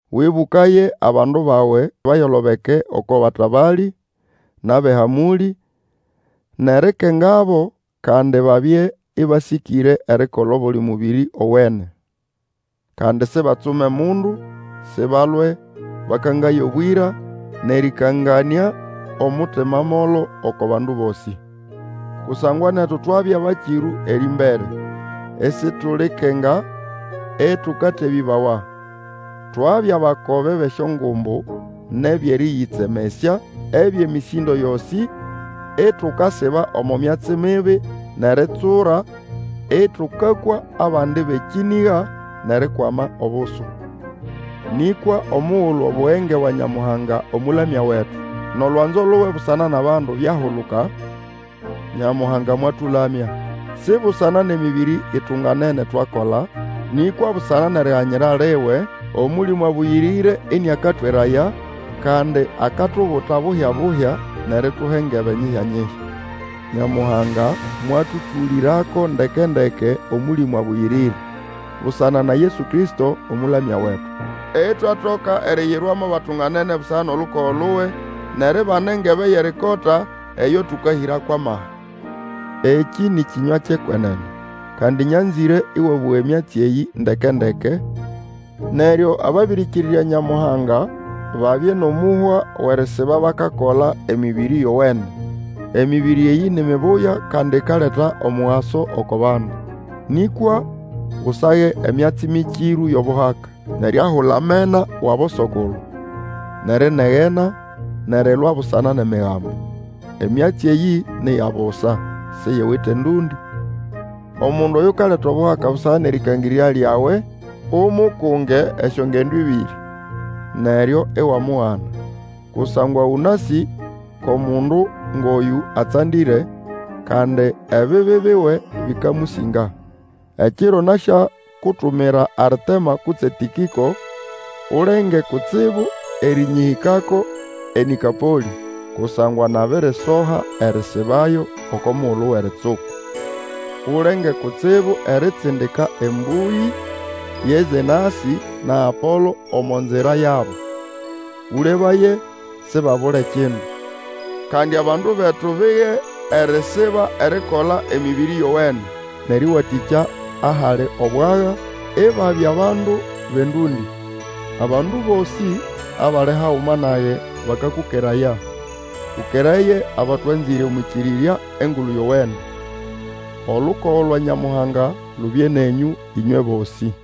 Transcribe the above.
Wĩbũkaye abandu bawe, bayolobeke oko batabalĩ, nʼabʼehamũlĩ, nʼerikengabo, kandi babye ĩbasĩkĩre erikola obuli mũbĩrĩ owene. Kandi sibatsume mundu, sibalwe, bakangaye obwĩra, nʼerĩkanganĩa omutima molo oko bandu bosĩ. Kusangwa netu twabya bakĩrũ erĩmbere, isitulikenga, ĩtũkatebĩbawa. Twabya bakobe bʼesyongumbu nʼebyʼerĩyĩtsemesya, ebyʼemĩsĩndo yosĩ, itukasiba omo myatsi mibi, nʼeritsura, ĩtũkakwa abandi bʼekĩnĩga, nʼerikwama obusu. Nĩkwa omugulu Obugenge bwa Nyamuhanga Omũlamya wetu, nʼolwanzo luwe busana nʼabandu byahuluka, Nyamuhanga mwatũlamya. Si busana nʼemĩbĩrĩ itunganene twakola, nĩkwa busana nʼeriganyira liwe, Omũlĩmũ Abũyĩrĩre ĩnĩakatweraya, kandi akatubuta bubya-buhya, nʼerituha engebe nyihyanyihya. Nyamuhanga mwatũtũlĩrako ndeke-ndeke Omũlĩmũ Abũyĩrĩre, busana na Yesu Kristo Omũlamya wetu, itwatoka eriyirwa mo batunganene busana nʼolukogo luwe, nʼeribana engebe yʼerikota, eyo tũkahĩra kwʼamaha. Ekĩ nĩ kĩnywa kyʼekwenene. Kandi nyanzĩre ĩwabũga emyatsi eyĩ ndeke-ndeke, neryo ababĩrĩkĩrĩrya Nyamuhanga babye nʼomũhwa wʼerisiba bakakola emĩbĩrĩ yowene. Emĩbĩrĩ eyĩ ni mibuya kandi ikaleta omugaso oko bandu. Nĩkwa Usage emyatsi mĩkĩrũ yʼobuhaka, nʼeriahula amena wʼaboso-kulu, nʼerinegena, nʼerilwa busana nʼEmigambo. Emyatsi eyĩ ni ya busa, siyiwite ndũndĩ. Omundu oyukaleta obuhaka busana nʼerĩkangĩrĩrya lyawe, umukunge esyongendo ĩbĩrĩ, neryo iwamugana. Kusangwa ũnasĩ kʼomundu ngʼoyũ atsandĩre, kandi ebibi biwe bĩkamũsĩnga. Ekiro nasyakutumira Artema kutse Tĩkĩko, ulenge kutsibu erĩnyĩhĩkako eNĩkopolĩ, kusangwa nabirisoha erisibayo oko mugulu wʼeritsuku. Ulenge kutsibu eritsindika embũyĩ ye Zenasĩ na Apolo omo nzira yabo. Ũlebaye sibabule kindu. Kandi abandu betu bige erisiba erikola emĩbĩrĩ yowene, nʼerĩwatĩkya ahali obwaga, ibabya bandu bʼendũndĩ. Abandu bosĩ abali haguma nage bakakũkeraya. Ũkeraye abatwanzĩre omwʼĩkĩrĩrya Engulu Yowene. Olukogo lwa Nyamuhanga lubye nenyũ, ĩnywe bosĩ.